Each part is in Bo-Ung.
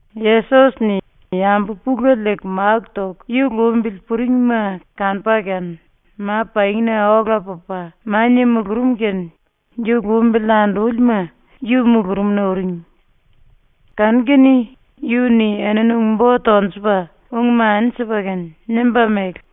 Yesos-ni yambu pulele liiku máku toku yu lumbili puringma kanupa kene ma-pangina ola pupa mania mulurum kene yu lumbili andúlima yu mulurumna uring. Kanu-kene yu-ni enini ung-bo tonjupa ung-mani sipa kene nimba mele: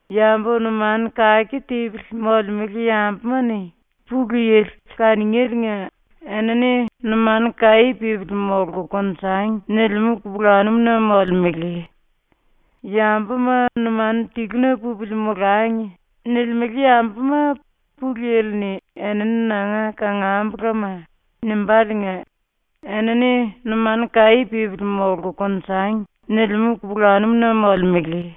“Yambu numanu kake tipili molemele yambuma-ni Pulu Yili kaningéliinga enini “Numanu kaí pípili molku konjangi.” nilimú kupulanum-na molemele. “‘Yambuma numanu tiluna pupili molangi.’ nilimele yambuma Pulu Yili-ni ‘Enini nanga kangambulama.’ nimbáliinga enini “Numanu kaí pípili molku konjangi.” nilimú kupulanum-na molemele.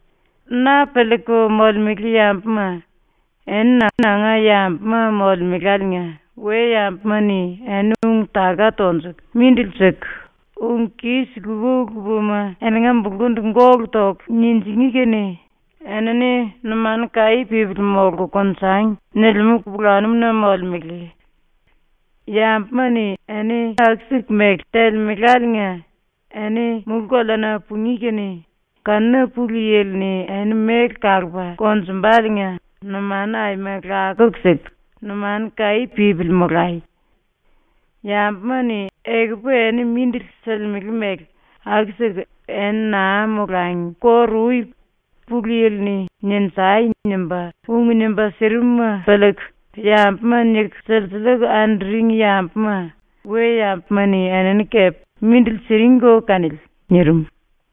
“Na piliiku molemele yambuma, eni nanga yambuma molemeláliinga we-yambuma-ni eni ung-taka tonjuku mindili siku, ung kis lupa-lupama eninga bulkundu gólu toku ninjingí kene eni “Numanu kaí pípili molku konjangi.” nilimú kupulanum-na molemele. ⸤Yambuma-ni eni aku-siku mele telemeláliinga⸥ eni mulú-koleana pungí kene kanuna Pulu Yili-ni eni méle kalupa konjumbaliinga numanu aima lakuku siku numanu kaí pípili molai. Yambuma-ni ekupu eni mindili silimele mele aku-siku eni naa molangi kóru-ui Pulu Yili-ni “Ninjai!” nimba ung nimba sirimuma piliiku yambuma niku silsiliiku anduring yambuma we-yambuma-ni enini kepe mindili siringko kanili.” ⸤nirim.⸥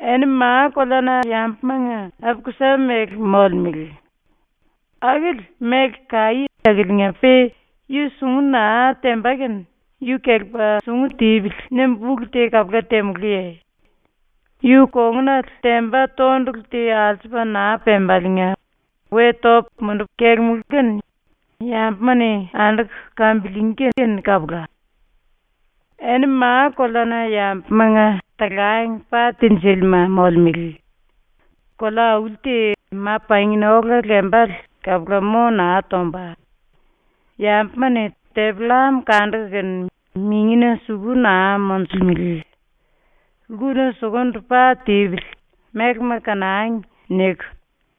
“Eni ma-koleana yambumanga api-kusa mele molemele. ⸤Akili méle kaí⸥ akiliinga-pe yu sungu naa temba kene ‘Yu kelepa sungu tipili.’ nimbu ulu te kapula temulúye? Yu kongunale temba tondulu te alsupa naa pembaliinga we topu mundupu kelemulú kene yambuma-ni anduku kambiliingí kene kapula. “Eni ma-koleana yambumanga talang pa tinjílima molemele. Kolea-auli te ma-pangina ola lembale kapula mo naa tomba. Yambuma-ni tepi-llam kanduku kene mingina suku naa monjulemele. ‘Lkuna sukundu pa tipili, mélema kanangi.’ niku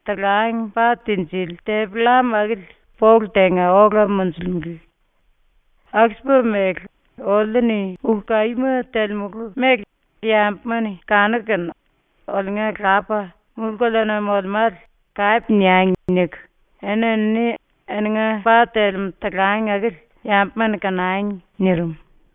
⸤talang pa tinjili⸥ tepi-llam akili polu tenga ola monjulemele. Aku-sipa mele ‘Oliu-ni ulu kaíma telemulu mele yambuma-ni kanuku kene oliunga Lapa, mulú-koleana molemále, kape niangi.’ niku, eni-enini eninga pa telemú talang akili yambuma-ni kanangi.” ⸤nirim.⸥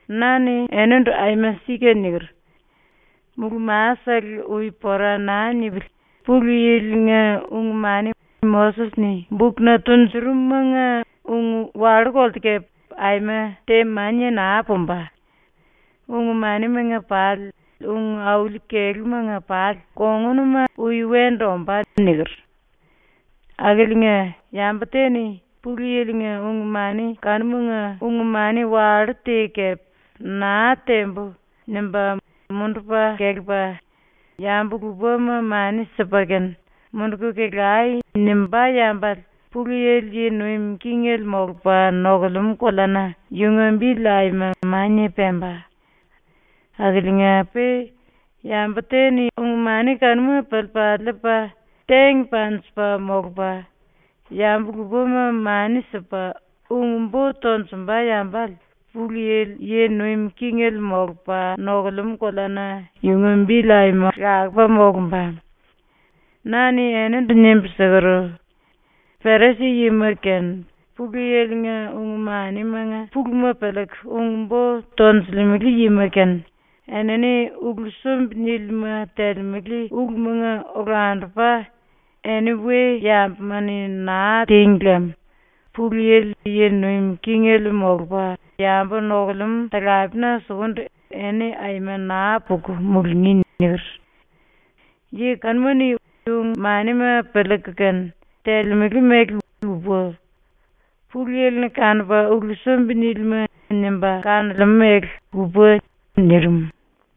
Na-ni enindu aima sika niker: “Mulú-masele ui pora naa nipili Pulu Yili-nga ung-mani ⸤Moses-ni bukna tunjurum⸥-manga ung wallú-kolte kepe aima te mania naa pumba. Ung-manimanga pali ung auli kelúmanga pali kongunuma ui wendu ombá.” niker. Akiliinga, yambu te-ni Pulu Yili-nga ung-mani kanumanga ung-mani wallú te kepe “Naa tembu.” nimba mundupa kelepa, yambu lupama mani sipa kene “Munduku kelai.” nimbá yambale Pulu Yili yi nuim kingele molupa nokulemú koleana yunga bili aima mania pemba. Akiliinga-pe yambu te-ni ung-mani kanuma piliipa liipa tingí panjipa molupa, yambu lupama mani sipa ung-bo tonjumba yambale Pulu Yili yi nuim kingele molupa nokulemú koleana yunga bili aima lakupa molumba. Na-ni enindu nimbu siker: “Perisi-yima kene Pulu Yili-nga ung-manimanga puluma piliiku ung-bo tonjilimele yima kene enini ulu sumbi-nílima telemele ulumanga olandupa eni we-yambuma-ni naa tíngi lem, Pulu Yili yi nuim kingele molupa yambu nokulemú talapena sukundu eni aima naa puku mulungí.” niker. ⸤Yi kanuma-ni ung-manima piliiku kene telemele mele lupa. Pulu Yili-ni kanupa ulu sumbi-nílima nimba kanolemú mele lupa.⸥” ⸤nirim.⸥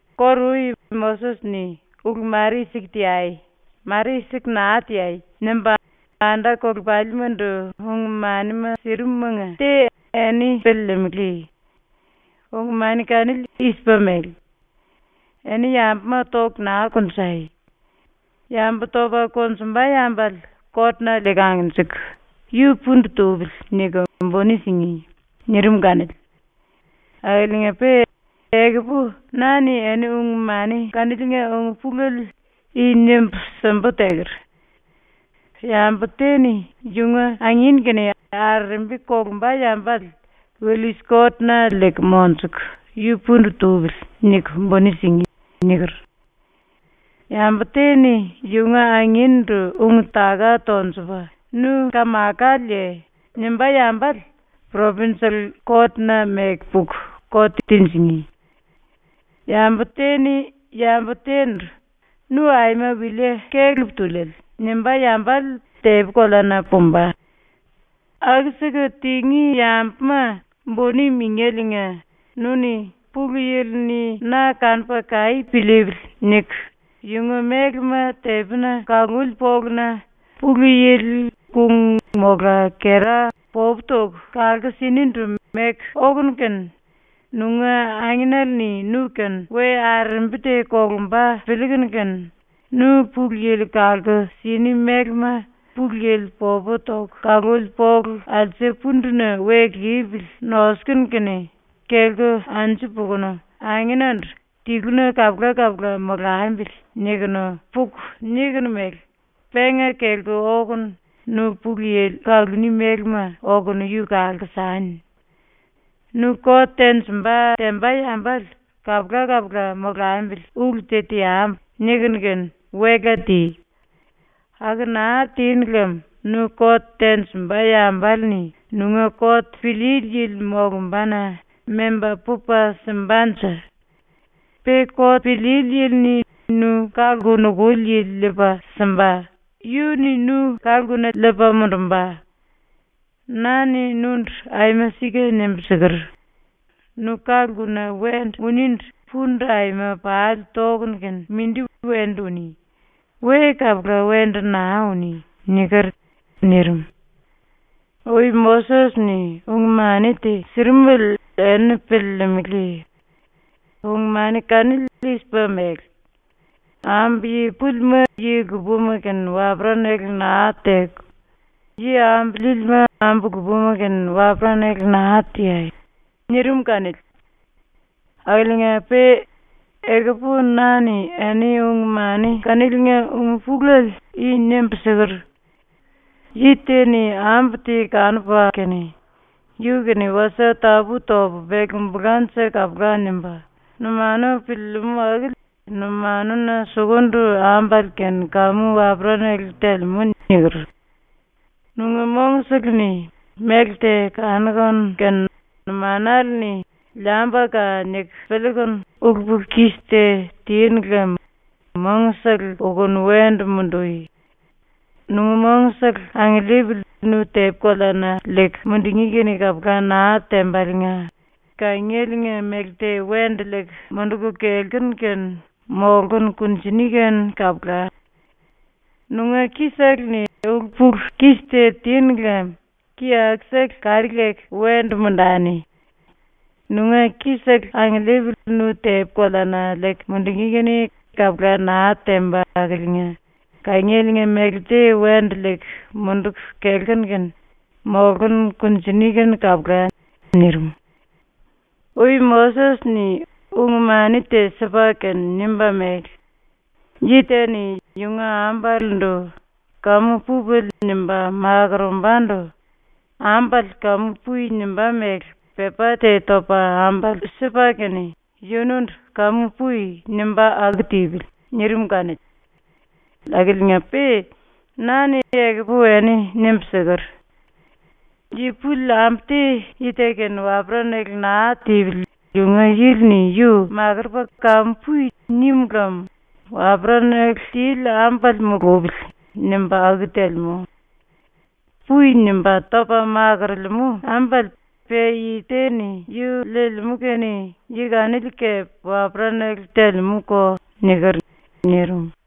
“Kóru-ui ⸤Moses-ni “Ulu mare i-siku teai! Mare i-siku naa teai!” nimba⸥ anda-kolepalimandu ung-manima sirim-manga te eni piliilimili. Ung-mani kanili i-sipa mele: “Eni yambuma toku naa konjai. Yambu topa konjumba yambale kot-na liiku angnjiku “Yu pundu tupili.” niku buni singí.” nirim kanili. Akiliinga-pe ekupu na-ni eni ung-mani kaniliinga ung-pulele i nimbu simbu teker: “Yambu te-ni yunga angin kene arerembi kolumba yambale willis-kot-na liiku monjuku “Yu pundu tupili.” niku buni singí.” niker. Yambu te-ni yunga angin-ndu ung-taka tonjupa “Nu kamakaleye?” nimbá yambale propinjel-kot-na meku puku kot tinjingí. Yambu te-ni yambu te-ndu “Nu aima wilie kelepa tuliele!” nimbá yambale tepi-koleana pumba. “Aku-siku tingí yambuma buni mingéliinga nu-ni ‘Pulu Yili-ni na kanupa kaí piliipili.’ niku yunga mélema tepina kaluli poluna Pulu Yili kung mola kera popu toku kalku sinindu meku okunu kene nunga angenele-ni nu-kene we arerembi te kolumba piliikunu kene, nu Pulu Yili kalku sini mélema Pulu Yili popu toku kaluli polu alse punduna we lipili nosukunu kene kelku anju pukunu angenandu “Tiluna kapula-kapula molambili.” nikunu puku nikunu mele, penga kelku okunu nu Pulu Yili kaluní mélema okunu yu kalku sani. “Nu kot tenjimba temba yambale ‘Kapula-kapula molambili ulu te teambu.’ nikunu kene wela ti. Aku naa tinu lem nu kot tenjimba yambale-ni nunga kot piliili yili molumbana memba pupa simbanje. Pe kot piliili yili-ni nu ka-lku nukuli yili liipa simba, yu-ni nu ka-lkuna liipa mundumba. Na-ni nundu aima sika nimbu siker: “Nu ka-lkuna wendu uníndu pundu aima pali tokunu kene mindi wendu uní. We kapula wendu naa uní.” niker.” ⸤nirim.⸥ “⸤Ui Moses-ni⸥ ung-mani te sirimele eni piliilimili. Ung-mani kanili i-sipa mele: ‘Ambu yi púlima yi lupama kene waperanale naa teku, yi ambu líílima ambu lupama kene waperanale naa teai.’ nirim kanili. Akiliinga-pe ekupu na-ni eni ⸤ung-mani kaniliinga ung-pulele⸥ i nimbu siker: “Yi te-ni ambu te kanupa kene ‘Yu kene wasie tapú-topu pelkumbulanje kapula.’ nimba numanuna piliilimú akili numanuna sukundu ambale kene kamu waperanale telemú.” niker. “Nunga mongsele-ni méle te kanukunu kene numanale-ni ‘Liambuka.’ niku piliikunu ulu-pulu-kis te tinu lem mongsele ukuku wendu mundui. Nunga mongsele angiliipili nu tepi-koleana liiku mundungí kene kapula naa tembaliinga kangieliinga méle te wendu liiku munduku kelkunu kene molkunu kunjini kene kapula. Nunga ki-sele-ni ulu-pulu-kis te tinu lem ki-akusele kari leku wendu mundani. Nunga ki-sele angiliipili nu tepi-koleana liiku mundungí kene kapula naa temba akiliinga kangieliinga méle te wendu liiku munduku kelkunu kene molkunu kunjini kene kapula.” ⸤nirim.⸥ “⸤Ui Moses-ni⸥ ung-mani te sipa kene nimba mele: “Yi te-ni yunga ambalendu ‘Kamu pupili.’ nimba makorombandu ambale “Kamu pui.” nimbá mele pepá te topa ambale sipa kene yundu “Kamu pui.” nimba aku tipili.” nirim kanili. Akiliinga-pe na-ni ekupu eni nimbu siker: “Yi puli ambu te yi te kene waperanale naa tipili yunga yili-ni yu makurupa “Kamu pui.” nim lem ‘Waperanale tili ambale mulupili.’ nimba aku telemú. “Pui.” nimba topa makorolemú ambale pe yi te-ni yu liilimú kene yi kanili kepe waperanale telemú-ko.” niker.” ⸤nirim.⸥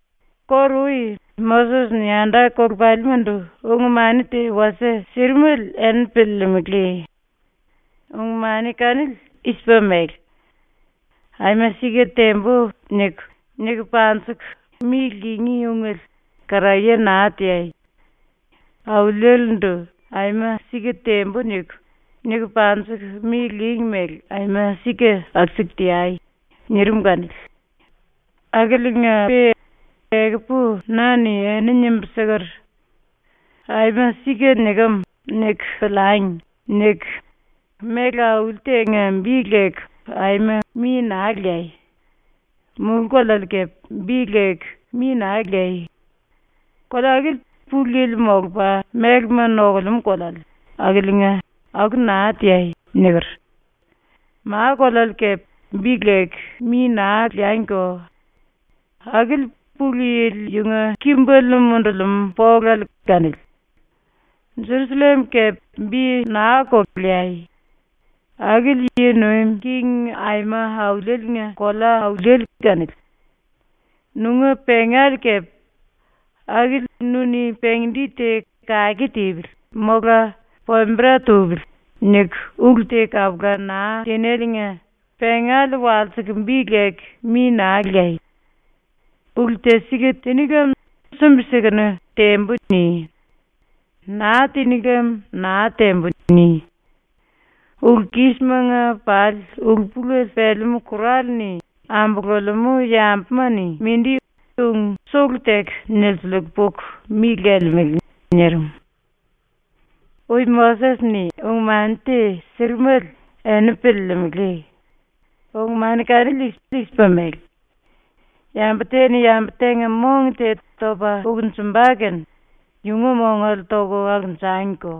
“Kóru-ui ⸤Moses-ni⸥ anda-kolepalimandu ung-mani te wasie sirimele eni piliilimili. Ung-mani kanili i-sipa mele: ‘ “Aima sika tembu.” niku, niku panjiku mi lingí ungele karaye naa teai. Auliele-ndu “Aima sika tembu.” niku, niku panjiku mi lingí mele aima sika aku-siku teai.’ nirim kanili. Akiliinga-pe ekupu na-ni eni nimbu siker: “‘ ‘Aima sika nikem.’ niku piliangi.’ niku méle auli tenga bi leku aima mi naa leai. Mulú-koleale kepe bi leku mi naa leai. Kolea akili Pulu Yili molupa mélema nokulemú koleale, akiliinga aku naa teai.” niker. Ma-koleale kepe bi leku mi naa leangiko. Akili Pulu Yili yunga kimbele mundulimú polale kanili. Jerusallem kepe bi naa-ko leai. Akili Yi Nuim King Aima Auliele-nga kolea-auliele kanili. Nunga pengale kepe. Akili nu-ni pengi-di te ‘Kake tipili.’ mola ‘Pombera tupili.’ niku ulu te kapula naa tinéliinga pengale walsiku bi leku mi naa leai. Ulu te sika tiní lem sumbi-sikunu “Tembu.” ni. Naa tiní lem “Naa tembu.” ni. Ulu-kisimanga pali ulu-pulele pelemú ⸤kur⸥ale-ni ambululemú yambuma-ni mindi ung sulu teku nilsiliiku puku mi lelemele.” ⸤nirim.⸥ “⸤Ui Moses-ni⸥ ung-mani te sirimele eni piliilimili. Ung-mani kanili i-sipa mele: “Yambu te-ni yambu tenga mong te topa ukunjumba kene yunga mongale toku ukunjangiko.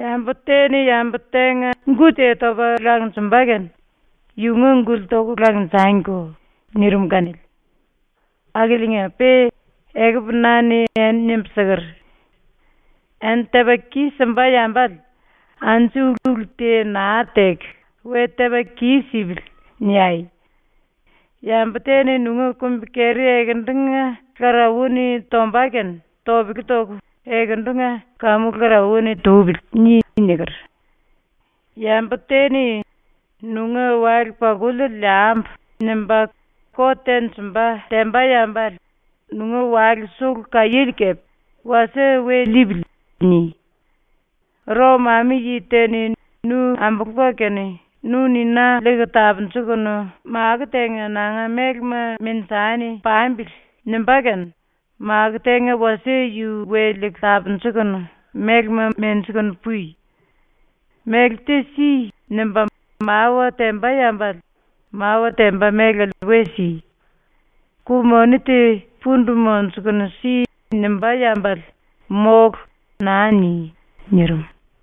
Yambu te-ni yambu tenga gu te topa langonjumba kene yunga gule toku langonjangiko.” nirim kanili. Akiliinga-pe ekupu na-ni eni nimbu siker: “Eni tepa kis-simba yambale anju ulu te naa teku, ‘We tepa kis-sipili.’ niai. Yambu te-ni nunga kumbi-keri ekendunga lkarauwa-ni tomba kene topele toku ‘Ekendunga kamu lkarauwa-ni tupili.’ ni.” niker. Yambu te-ni ‘Nunga wale-pakuliele liambu.’ nimba kot tenjimba temba yambale nunga wale sulu kaiéle kepe ‘wasie we liipili.’ ni. ⸤Rom-ami-⸥yi te-ni nu ambulupa kene “Nu-ni na liiku tapunjukunu makó tenga ⸤nanga mélema menjani⸥ pambili.” nimbá kene makó tenga wasie yu we liiku tapunjukunu mélema menjikunu pui. “Méle te si.” nimba mawa temba yambale mawa temba mélale we si. “Ku-moni te pundu monjukunu si.” nimbá yambale “Mólu.” naa ni.” ⸤nirim.⸥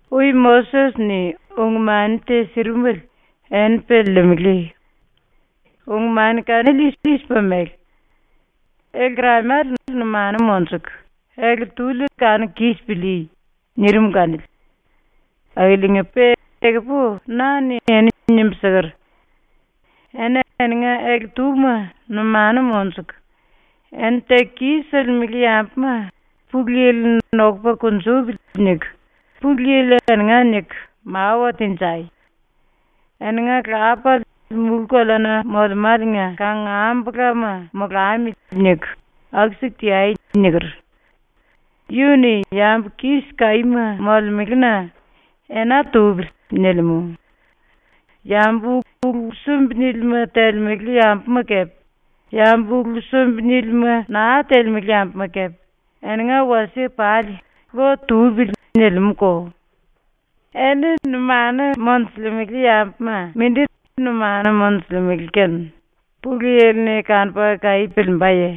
“⸤Ui Moses-ni⸥ ung-mani te sirimele eni piliilimili. Ung-mani kanili i-sipa mele: “Ele-lkeramale numanu monjuku, ele-túli kanuku kis pilíí.” nirim kanili. Akiliinga-pe ekupu na-ni eni nimbu siker: “Eni eninga ele-túma numanu monjuku, eni teku kis-silimele yambuma ‘Pulu Yili-ni nokupa kunjupili.’ niku Pulu Yili eninga niku mawa tenjai. ‘Eninga Lapale mulú-koleana molemáliinga kangambulama molamili.’ niku aku-siku teai.” niker. Yu-ni yambu kis kaíma molemelena ‘Ena tupili.’ nilimú. Yambu ulu sumbi-nílima telemele yambuma kepe yambu ulu sumbi-nílima naa telemele yambuma kepe eninga wasie pali ‘Lo tupili.’ nilimú-ko. “Eni numanu monjulemele yambuma mindi numanu monjulemele kene Pulu Yili-ni kanupa kaí piliimbaye?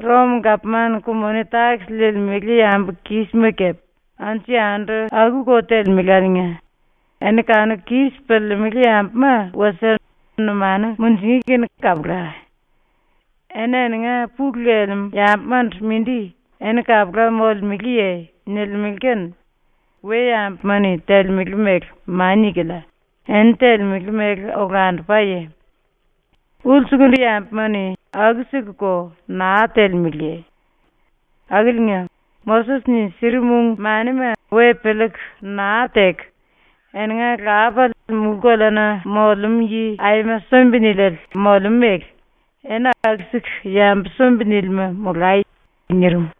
⸤Rom-gapman⸥ ku-moni-takis liilimele yambu ⸤kis⸥ma kepe anju-yandu aku-ko telemeláliinga ⸤eni kanuku kis piliilimili yambuma wasie numanu munjingí kene kapula⸥. Eni eninga pulu lelemú yambumandu mindi “Eni kapula molemeleye?” nilimele kene we-yambuma-ni telemele mele mania-kilia, eni telemele mele olandupaye? Ulsukundu yambuma-ni aku-sikuko naa telemeleye? Akiliinga ⸤Moses-ni sirim ung-manima we piliiku naa teku,⸥ eninga Lapale mulú-koleana molemú yi aima sumbi-niliele molemú mele eni aku-siku yambu sumbi-nílima molai.” ⸤nirim.⸥